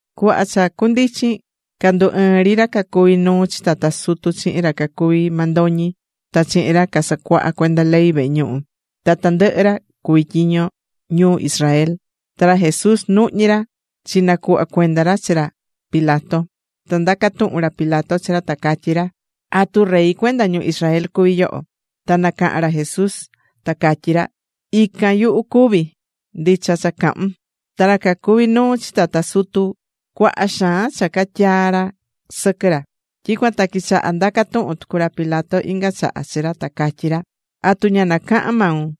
Cuhva cha cundichin candu ɨɨ̱n ri ra cacuví nuu chi tata sutu chihin ra cacuví mandoñi ta chihin ra casacuahá cuenda ley vehe ñuhu ta tandɨhɨ ra cuví tyiño ñu Israel. Ta ra Jesús nuhñí ra, chinacuhva cuenda ra chi ra chi ra Pilato. Ta ndaca̱ tuhun ra Pilato chi ra, ta catyí ra: ―¿Atu rey cuenda ñu Israel cuví yoho? Ta nacaha̱n ra Jesús ta catyí ra: ―Ican, yuhu cuvi. Ndicha cha cahún. Ta ra cacuví nuu chi tata sutu cuaha xaan cha catyaa̱ ra sɨquɨ ra. Tyicuan ta quichaha̱ ndaca tuhun tucu ra Pilato inga chaha chi ra, ta catyí ra: ―¿Atu ña nacahan maun?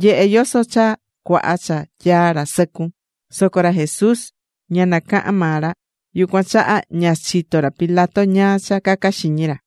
Nye̱he yoso cha cuaha cha tyaá ra sɨcun. Soco ra Jesús ña nacaha̱n maa ra. Yucuan chaha ña chitó ra Pilato ñáá cha caca xiñi ra.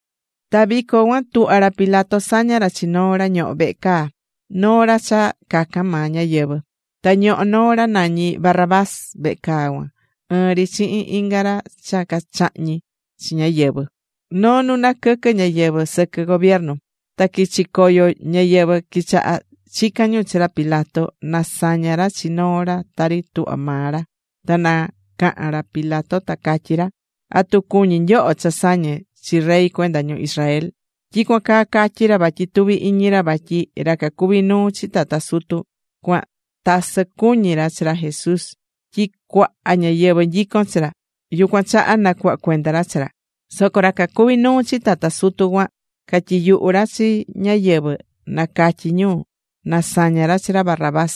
Ta vico cuan tuhvá ra Pilato saña ra chi noo ra ñohó vehe caa, noo ra cha cacan maa ñáyɨvɨ. Ta ñohó noo ra nañí Barrabás vehe caa cuan, ɨɨn ri chihin inga ra cha cachahñi̱ chi ñáyɨvɨ noo nu naquɨquɨ̱ ñáyɨvɨ sɨquɨ gobiernu. Ta quichi̱ coyo ñáyɨvɨ quichaha̱ chican ñu chi ra Pilato na saña ra chi noo ra tari tuhvá maa ra. Ta nacaha̱n ra Pilato, ta catyí ra: ―¿Atu cuñí nyoho cha sañe chi Rey cuenda ñu Israel? Tyicuan caa catyi̱ ra vatyi tuví iñi ra vatyi ra cacuví nuu chi tata sutu cuan tasɨ cuñí ra chi ra Jesús tyi cuaha ñáyɨvɨ nyicón chi ra, yucuan chaha nacuhva cuenda ra chi ra. Soco ra cacuví nuu chi tata sutu cuan catyiyuhu̱ ra chi ñáyɨvɨ na catyi ñu na saña ra chi ra Barrabás.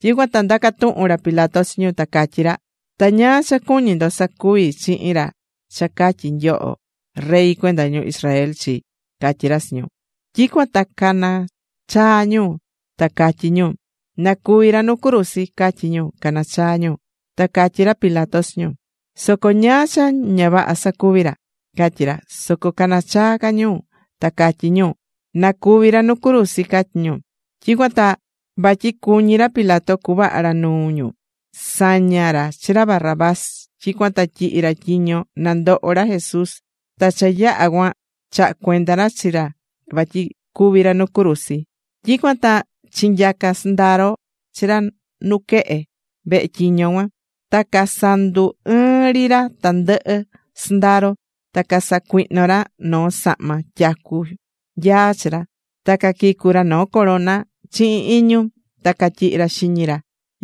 Tyicuan ta ndaca̱ tuhun ra Pilato chi ñu, ta catyí ra: ―¿Ta ñáá cha cuñí ndo sacuvi chihin ra cha catyí nyoho Rey cuenda ñu Israel chi? ―catyí ra chi ñu. Tyicuan ta nacanachaa̱ ñu, ta catyí ñu: ―¡Na cúvi ra nu cruzi! ―catyí ñu, canachaá ñu. Ta catyí ra Pilato chi ñu: ―Soco ¿ñáá cha ña vaha sacuvi̱ ra? ―catyí ra. Soco canachaa̱ ca ñu ta catyí ñu: ―¡Na cúvi ra nu cruzi! ―catyí ñu. Tyicuan ta vatyi cuñí ra Pilato cuvaha ra nuu ñu, saña̱ ra chi ra Barrabás. Tyicuan ta tyihi̱ ra tyiño na ndoho ra Jesús, ta cha yaha cuan chaha̱ cuenda ra chi ra vatyi cúvi ra nu cruzi. Tyicuan ta chinyaca̱ sɨndaro chi ra nuquehe vehe tyiño cuan. Ta casandu ɨɨ̱n ri ra tandɨhɨ sɨndaro. Ta casacuihno̱ ra noo sahma tyacu nyaa chi ra. Ta caquicu̱ ra noo corona chihin iñu. Ta catyihi̱ ra xiñi ra.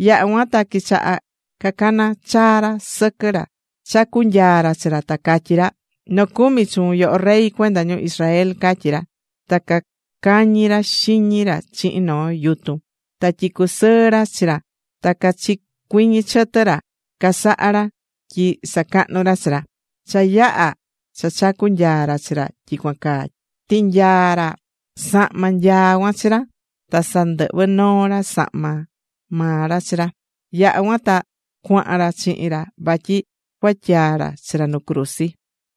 Yaha̱ cuan ta quichaha cacana̱ chaa ra sɨquɨ ra chacú nyaa ra chi ra, ta catyí ra: ―¡Nocumi chuun, yoho Rey cuenda ñu Israel! ―catyí ra. Ta cacañi ra xiñi ra chihin noo yutun, ta tyicú sɨɨ ra chi ra. Ta cachicuiñi̱ chɨtɨ ra casaha ra tyi sacahnu ra chi ra. Cha yaha̱ cha chacu̱ nyaa ra chi ra tyicuan caa, tinyaa̱ ra sahma nyaa cuan chi ra, ta sandɨhvɨ̱ noo ra sahma maa ra chi ra. Yaha̱ cuan ta cuahan ra chihin ra vatyi cuatyaa ra chi ra nu cruzi.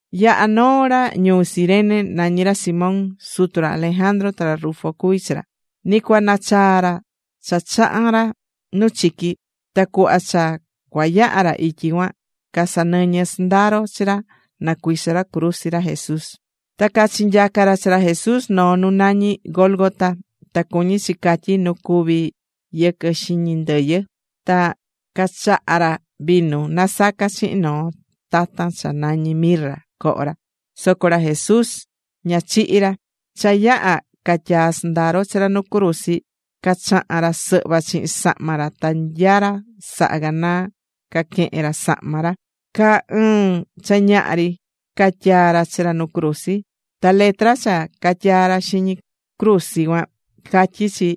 Yahá noo ra ñuu Cirene, nañí ra Simón. Sutu ra Alejandro ta ra Rufo cuví chi ra. Ni cua nachaa ra cha chaha̱n ra nu chiqui. Ta cuhva cha cua yaha ra ityi cuan, casanɨñɨ̱ sɨndaro chi ra na cuiso ra cruzi ra Jesús. Ta cachinyaca̱ ra chi ra Jesús noo nu nañí Gólgota. Ta cuñí chi catyi: Nu Cuví Yɨquɨ Xiñi Ndɨyɨ. Ta cachaha̱ ra vinu nasaca̱ chihin noo tatan cha nañí mirra coho ra. Soco ra Jesús ña chihi̱ ra. Cha yaha̱ catyaa̱ sɨndaro chi ra nu cruzi, cachaha̱n ra sɨhva chihin sahma ra ta nya ra saha̱ ganaa caquehen ra sahma ra. Caa ɨɨn cha ñaha ri catyaa̱ ra chi ra nu cruzi. Ta letra cha catyaa̱ ra xiñi cruzi cuan, catyí chi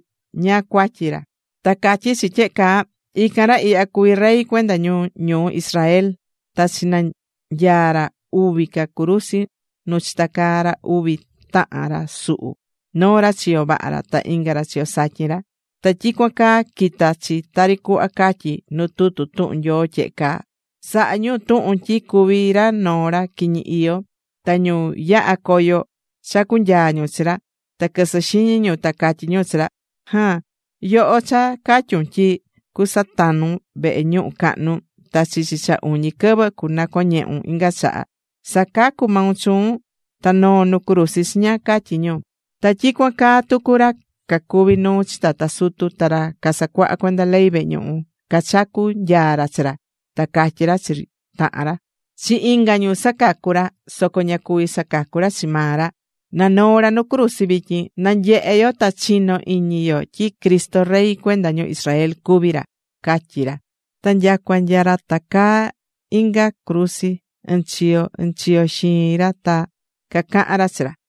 ñáá cuatyi ra. Ta catyí chi tyehe caa: “Ican ra ihya cuví Rey cuenda ñu ñuu Israel.” Ta chinanyaa̱ ra uvi ca cruzi nu chitacaa̱ ra uvi tahan ra suhu, noo ra chiyo vaha ra, ta inga ra chiyo satyin ra. Ta tyicuan caa quita̱ chi tari cuhva catyí nu tutu tuhun Nyoo tyehe caa: “Sahá ñu tuhun tyi cuví ra noo ra quiñi iyó.” Ta ñu yahá coyo chacú nyaa ñu chi ra. Ta quɨsɨ́ xiñi ñu, ta catyí ñu chi ra: ―¡Jaan! ¡Yoho cha catyu̱n tyi cusatanun vehe ñuhu cahnu, ta chichi cha uñi quɨvɨ cunacoñehun inga chaha! ¡Sa̱cacu maun chuun ta no̱o nu cruzi chiña! ―catyí ñu. Ta tyicuan caa tucu ra cacuví nuu chi tata sutu ta ra casacuahá cuenda ley vehe ñuhu, cachacú nyaa ra chi ra, ta catyí ra chi tahan ra: ―¡Chi inga ñu sacacu̱ ra, soco ña cuví sacacu ra chi maa ra! Na noo ra nu cruzi vityin, na nyehe yo ta chino iñi yo tyi Cristo Rey cuenda ñu Israel cuví ra ―catyí ra. Ta nyacua nya ra tacaá inga cruzi ɨnchiyo ɨnchiyo xiin ra ta cacahán ra chi ra.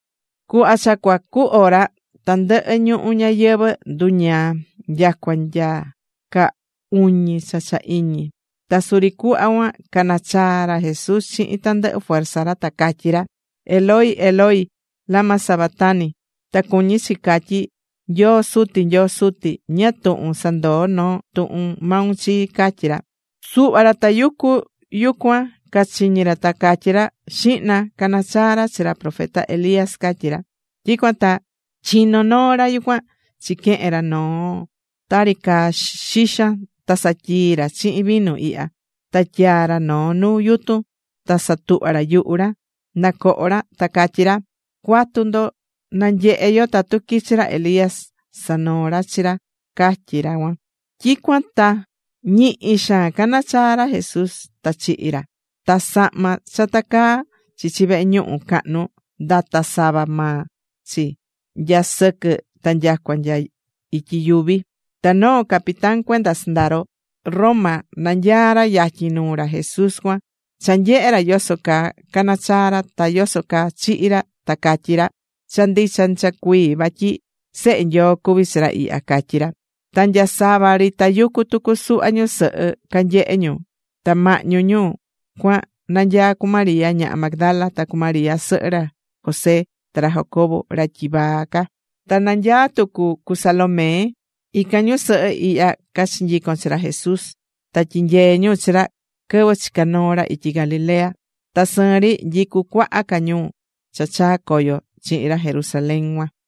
Cuhva cha cua cu hora, tandɨhɨ ñuhu ñayɨvɨ̱ nduñaa, nyacua nya caa uñi cha cha iñi. Ta suri cuhva cuan canachaa̱ ra Jesús chihin tandɨhɨ fuerza ra, ta catyí ra: ―Eloi, Eloi, ¿lama sabactani? ―ta cuñí chi catyí: Nyoo Suti, Nyoo Suti, ¿ñáá tuhun sandoo̱ noo tuhun maun chii? ―catyí ra. Suhva ra tayucu yucuan cachiñí ra ta catyí ra: ―¡Xihna! Caná chaa ra chi ra profeta Elías ―catyí ra. Tyicuan ta chino̱ noo ra yucuan chiquehe̱n ra noo tari caa xixan ta satyii̱ ra chihin vinu iya. Ta tyaa̱ ra noo nu yutun ta satuhva̱ ra yuhu ra na coho ra, ta catyí ra: ―Cua̱tu ndo. Na nyehe yo tatu quichi ra Elías sanoo ra chi ra ―catyí ra cuan. Tyicuan ta ñihi xaan canachaa̱ ra Jesús, ta chihi̱ ra. Ta sahma cha tacaá chichi vehe ñuhu cahnu ndata̱ sava maa chi, nya sɨquɨ ta nyacua nya ityi yuvi. Ta noo capitán cuenda sɨndaro Roma nanyaá ra yatyin nuu ra Jesús cuan. Cha nyehe̱ ra yoso caa cana̱ chaa ra, ta yoso caa chihi̱ ra, ta catyí ra: ―Cha ndicha ndicha cuii vatyi Sehe Nyoo cuví chi ra ihya ―catyí ra. Ta nya sava ri tayucú tucu suhva ñusɨhɨ canyehé ñu. Ta mahñu ñu cuan nanyaá cu María ñaha Magdala, ta cu María sɨhɨ ra José ta ra Jacobo ra tyivaa ca. Ta nanyaá tucu cu Salomé. Ican ñusɨhɨ ihya cachinyico̱n chi ra Jesús, ta tyinyeé ñu chi ra quɨvɨ chica̱ noo ra ityi Galilea. Ta sɨɨn ri nyicú cuaha ca ñu cha chaa̱ coyo chihin ra Jerusalén cuan.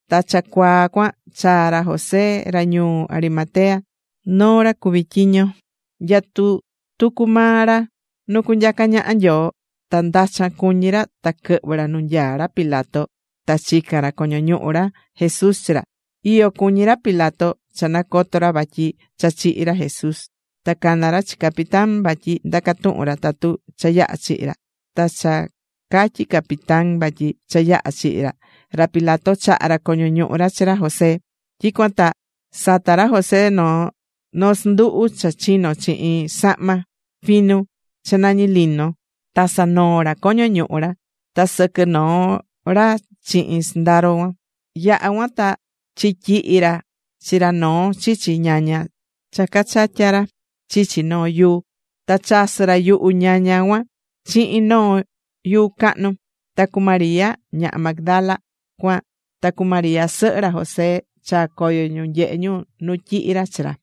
Ta cha cuaa cuan chaa̱ ra José ra ñuu Arimatea. Noo ra cuví tyiño. Nyatú tucu maa ra nu cunyaca ñaha Nyoo. Ta ndachan cuñí ra ta quɨhvɨ̱ ra nu nyaá ra Pilato, ta chica̱n ra coño ñuhu ra Jesús chi ra. Iyo cuñí ra Pilato cha nacoto̱ ra vatyi cha chihi̱ ra Jesús. Ta cana̱ ra chi capitán vatyi ndaca tuhun ra tatu cha yaha̱ chihi̱ ra. Ta cha catyi̱ capitán vatyi cha yaha̱ chihi̱ ra, ra Pilato chaha̱ ra coño ñuhu ra chi ra José. Tyicuan ta sata̱ ra José noo sɨnduhu cha chino̱ chihin sahma finu cha nañi lino, ta sanoo̱ ra coño ñuhu ra. Ta sɨquɨ̱ noo ra chihin sɨnduhu cuan. Yaha̱ cuan ta chityihi̱ ra chi ra noo chichi ñaña cha cachatya̱ ra chichi noo yuu. Ta chasɨ̱ ra yuhu ñaña cuan chihin noo yuu cahnu. Ta cu María ñaha Magdala cuan ta cu María sɨhɨ ra José, chaa̱ coyo ñu nyehe ñu nu tyihi̱ ra chi ra.